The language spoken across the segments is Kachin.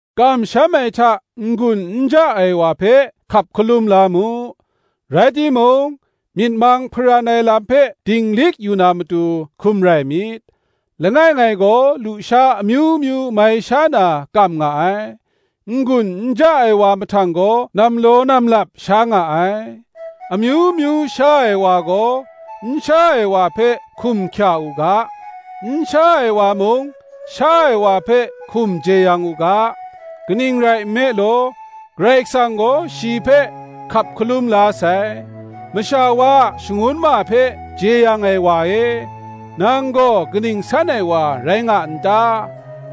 Kamsham ai hta n-gun n ja ai wa hpe hkap hkalum la mu: rai timung, myit mang hparan ai lam hpe dinglik yu na matu, hkum rai myit. Langai ngai gaw lusha amyu myu mai sha na kam nga ai, n-gun n ja ai wa mahtang gaw nam law nam lap sha nga ai. Amyu myu sha ai wa gaw, n sha ai wa hpe hkum hkya u ga; n sha ai wa mung, sha ai wa hpe hkum jeyang u ga; kaning rai nme law, Karai Kasang gaw shi hpe hkap hkalum la sai. Masha wa a shangun ma hpe jeyang ai wa e, nang gaw kaning san ai wa rai nga n ta?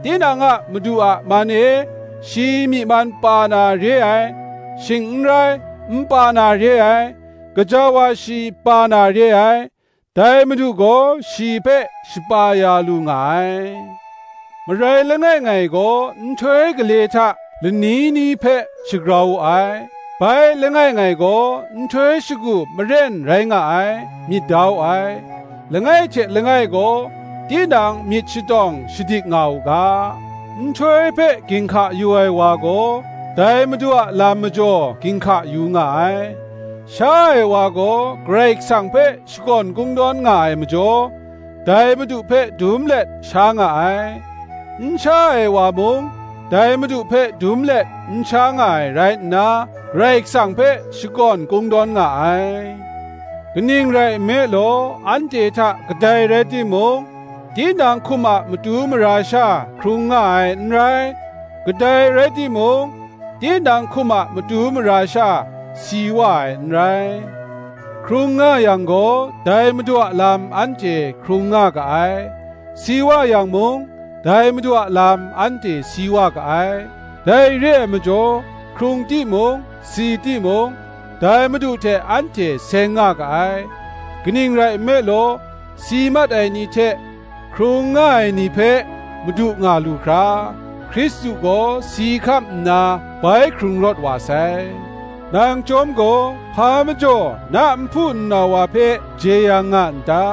Tinang a madu a man e shi myi man pa na re ai, shing n rai, n pa na re ai; gaja wa shi pa na re ai; dai Madu gaw shi hpe shapa ya lu nga ai. Marai langai ngai gaw nhtoi gale hta lani ni hpe shagrau wu ai; bai, langai ngai gaw, nhtoi shagu maren rai nga ai, myit da wu ai: langai hte langai gaw tinang myit shatawng shadik nga u ga. Nhtoi hpe ginhka yu ai wa gaw, dai Madu a lam majaw ginhka yu nga ai: sha ai wa gaw, Karai Kasang hpe shakawn kungdawn nga ai majaw, dai Madu hpe dum let sha nga ai; n sha ai wa mung, dai Madu hpe dum let n sha nga ai rai nna, Karai Kasang hpe shakawn kungdawn nga ai. Kaning rai nme law, anhte hta kadai rai timung, tinang hkum a matu mara sha hkrung nga ai n rai; kadai rai timung, tinang hkum a matu mara sha si wa ai n rai; Hkrung nga yang gaw, dai Madu a lam anhte hkrung nga ga ai; si wa yang mung, dai madu a lam anhte si wa ga ai. Dai re ai majaw, hkrung timung si timung, dai Madu hte anhte seng nga ga ai. Kaning rai nme law, si mat ai ni hte hkrung nga ai ni hpe madu nga lu hkra, Hkristu gaw si hkam nna bai hkrung rawt wa sai. Nang chyawm gaw, hpa majaw na nhpu nnau wa hpe jeyang nga n ta?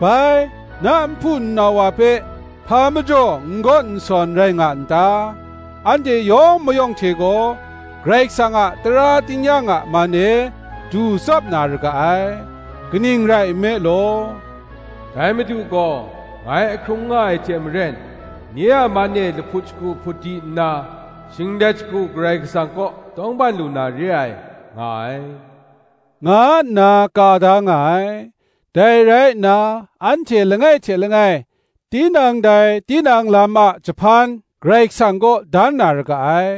bai, na nhpu nnau wa hpe hpa majaw n gawn n sawn rai nga n ta? Anhte yawng mayawng hte gaw, Karai Kasang a tara tingnyang a man e du tsap na ra ga ai. Kaning rai nme law, “Dai Madu gaw, Ngai ahkrung nga ai hte maren, nye a man e lahput shagu hput di nna, Shinglet shagu Karai Kasang kaw tawngban lu na re ai, nga ai,” nga nna ka da nga ai. Dai rai nna, anhte langai hte langai, tinang dai tinang lam a jahpan, Karai Kasang kaw dan na ra ga ai.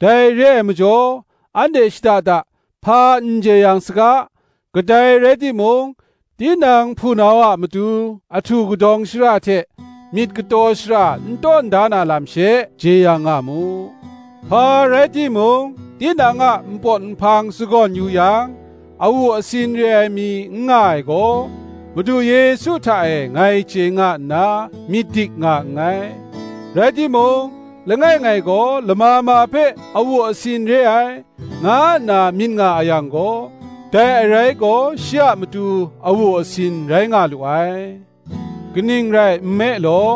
Dai re ai majaw, anhte shada da hpa n jeyang saga; kadai rai timung, tinang hpunau a matu ahtu kadawng shara hte myit kataw shara n tawn da na lam she, jeyang nga mu. Hpa rai timung, tinang a npawt nhpang sa gawn yu yang, awu asin re ai mi n nga ai gaw, Madu Yesu hta e ngai chye nga nna myit dik nga nngai: rai timung, langai ngai gaw lama ma hpe awu asin re ai, nga nna myit nga a yang gaw, dai arai gaw shi a matu awu asin rai nga lu ai. Kaning rai nme law,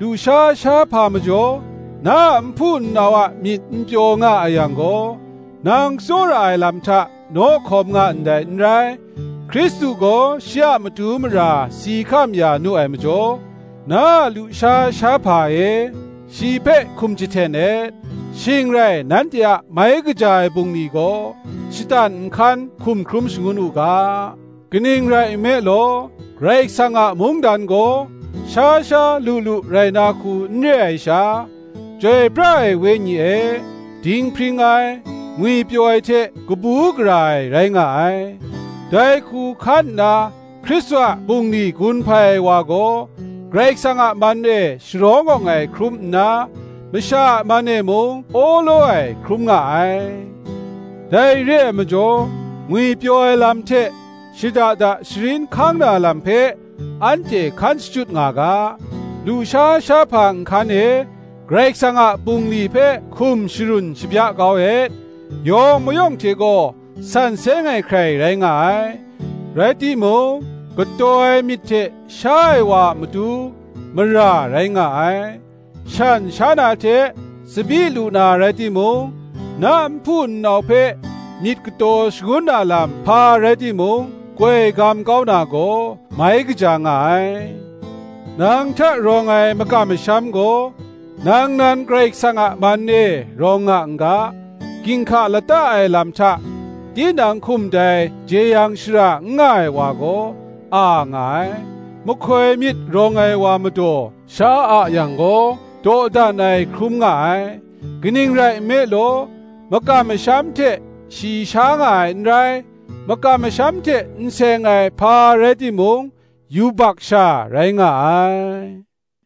lusha shahpa majaw na a nhpu nnau a myit n pyaw nga a yang gaw, nang tsawra ai lam hta naw hkawm nga ndai n rai. Hkristu gaw shi a matu mara si hkam ya nu ai majaw, na a lusha shahpa e shi hpe hkum jahten et. Shing rai nanhte a mai kaja ai bungli gaw, shatan nhkan hkum hkrum shangun u ga. Kaning rai nme law, Karai Kasang a mungdan gaw, sha sha, lu lu rai na hku n re ai sha, Chyoi pra ai Wenyi e, dinghpring ai, ngwipyaw ai hte kabu gara ai, rai nga ai. Dai hku hkan nna Hkristu a bungli gun hpai ai wa gaw, Karai Kasang a man e sharawng awng ai hkrum nna, masha a man e mung awlaw ai hkrum nga ai. Dai re ai majaw, ngwipyaw ai lam hte, shada da sharin hkang na lam hpe, anhte hkan shachyut nga ga. Lusha shahpa nhkan e Karai Kasang a bungli hpe hkum sharun shabya kau et. Yawng mayawng hte gaw san seng ai hkrai rai nga ai; rai timung kataw ai myit hte sha ai wa a matu, mara rai nga ai. Shan sha na hte tsabyi lu na rai timung, na nhpu nnau hpe myit kataw shangun na lam hpa rai timung koi gam kau na gaw, mai kaja nga ai. Nang hta rawng ai makam masham gaw, nang nan Karai Kasang a man e rawng nga n ga: ginhka lata ai lam hta tinang hkum dai jeyang shara n nga ai wa gaw, a nga ai. Mahkoi myit rawng ai wa madaw sha a yang gaw, dawdan ai hkrum nga ai; kaning rai nme law, makam masham hte shi sha nga ai n rai: makam masham hte n seng ai hpa rai timung, yubak sha rai nga ai.